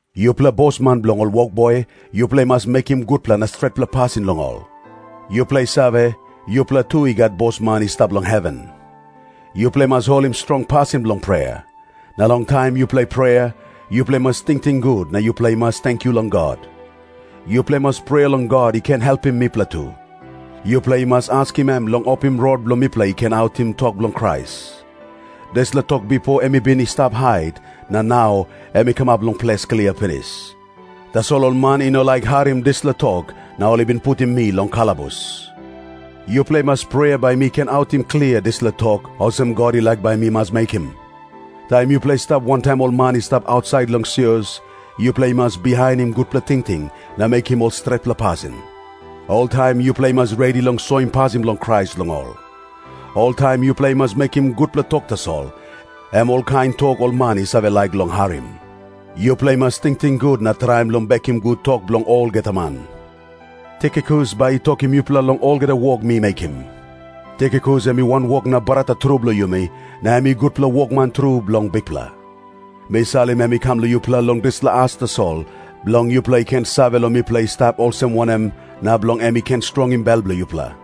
Yupela bosman bilong ol wokboi, yupela i mas mekim gutpela na stretpela pasin long ol. Yupela i save, yupela tu i gat Bosman i stap long heven. Yupela i mas holim strong pasin bilong prea. Na long taim yupela i prea, yupela i mas tingting gut na yupela i mas tenkyu long God. Yupela i mas prea long God i ken helpim mipela tu. Yupela i mas askim em long opim rot bilong mipela i ken autim tok bilong Krais. Dispela tok bipo em i bin i stap hait, na nau em i kamap ples klia pinis. Tasol ol man i no laik harim dispela tok, na ol i bin putim mi long kalabus. Yupela i mas prea bai mi ken autim klia dispela tok, olsem God i laik bai mi mas mekim. Taim yupela i stap wantaim ol man i stap ausait long sios, yupela i mas bihainim gutpela tingting na mekim ol stretpela pasin. Oltaim yupela i mas redi long soim pasin bilong Krais long ol. Oltaim yupela i mas mekim gutpela tok tasol, em olkain tok ol man i save laik long harim. Yupela i mas tingting gut na traim long bekim gut tok bilong olgeta man. Tikikus bai i tokim yupela long olgeta wok mi mekim. Tikikus em i wanwok na brata tru bilong yumi, na em i gutpela wokman tru bilong Bikpela. Mi salim em i kam long yupela long dispela as tasol, bilong yupela i ken save long mipela i stap olsem wanem, na bilong em i ken strongim bel bilong yupela.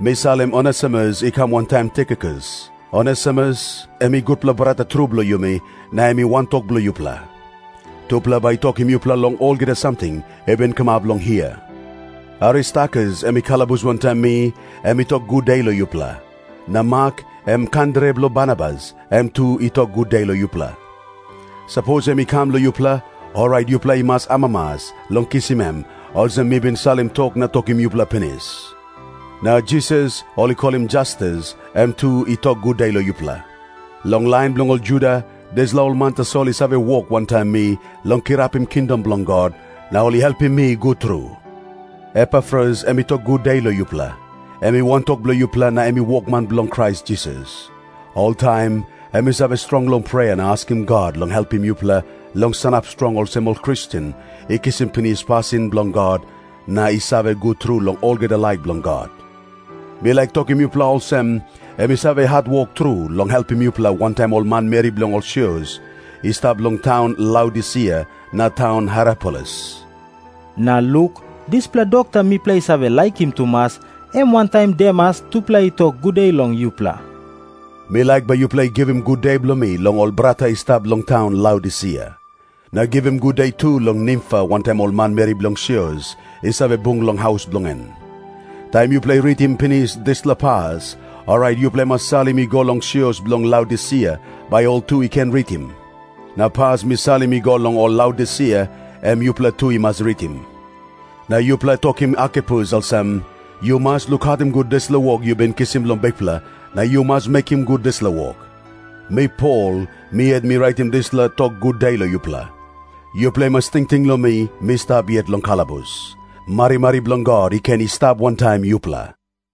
Mi salim Onesimus i kam wantaim Tikikus. Onesimus em i gutpela brata tru bilong yumi, na em i wantok bilong yupela. Tupela bai i tokim yupela long olgeta samting i bin kamap long hia. Aristarkus, em i kalabus wantaim mi, em i tok gude long yupela. Na Mak, em kandere bilong Barnabas, em tu i tok gude long yupela. Sapos em i kam long yupela, orait yupela i mas amamas long kisim em, olsem mi bin salim tok na tokim yupela pinis. Na Jisas, ol i kolim Jastus, em tu i tok gude long yupela. Long lain bilong ol Juda, dispela ol man tasol i save wok wantaim mi long kirapim kingdom bilong God, na ol i helpim mi gut tru. Epafras em i tok gude long yupela. Em i wantok bilong yupela na em i wokman bilong Krais Jisas. Oltaim em i save strong long prea na askim God long helpim yupela long sanap strong olsem ol Kristen i kisim pinis pasin bilong God na i save gut tru long olgeta laik bilong God. Mi laik tokim yupela olsem, em i save hatwok tru long helpim yupela wantaim ol manmeri bilong ol sios i stap long taun Laodisia na taun Hierapolis. Na Luk, dispela dokta mipela i save laikim tumas, em wantaim Demas tupela i tok gude long yupela. Mi laik bai yupela i givim gude bilong mi long ol brata i stap long taun Laodisia. Na givim gude tu long Nimfa wantaim ol manmeri bilong sios i save bung long haus bilong en. Taim yupela i ritim pinis dispela pas, orait yupela i mas salim i go long sios bilong Laodisia, bai ol tu i ken ritim. Na pas mi salim i go long ol Laodisia, em yupela tu i mas ritim. Na yupela tokim Arkipus olsem, “Yu mas lukautim gut dispela wok yu bin kisim long Bikpela, na yu mas mekim gut dispela wok.” Mi Pol, mi yet mi raitim dispela tok gude long yupela. Yupela i mas tingting long mi, mi stap yet long kalabus. Marimari bilong God i ken i stap wantaim yupela.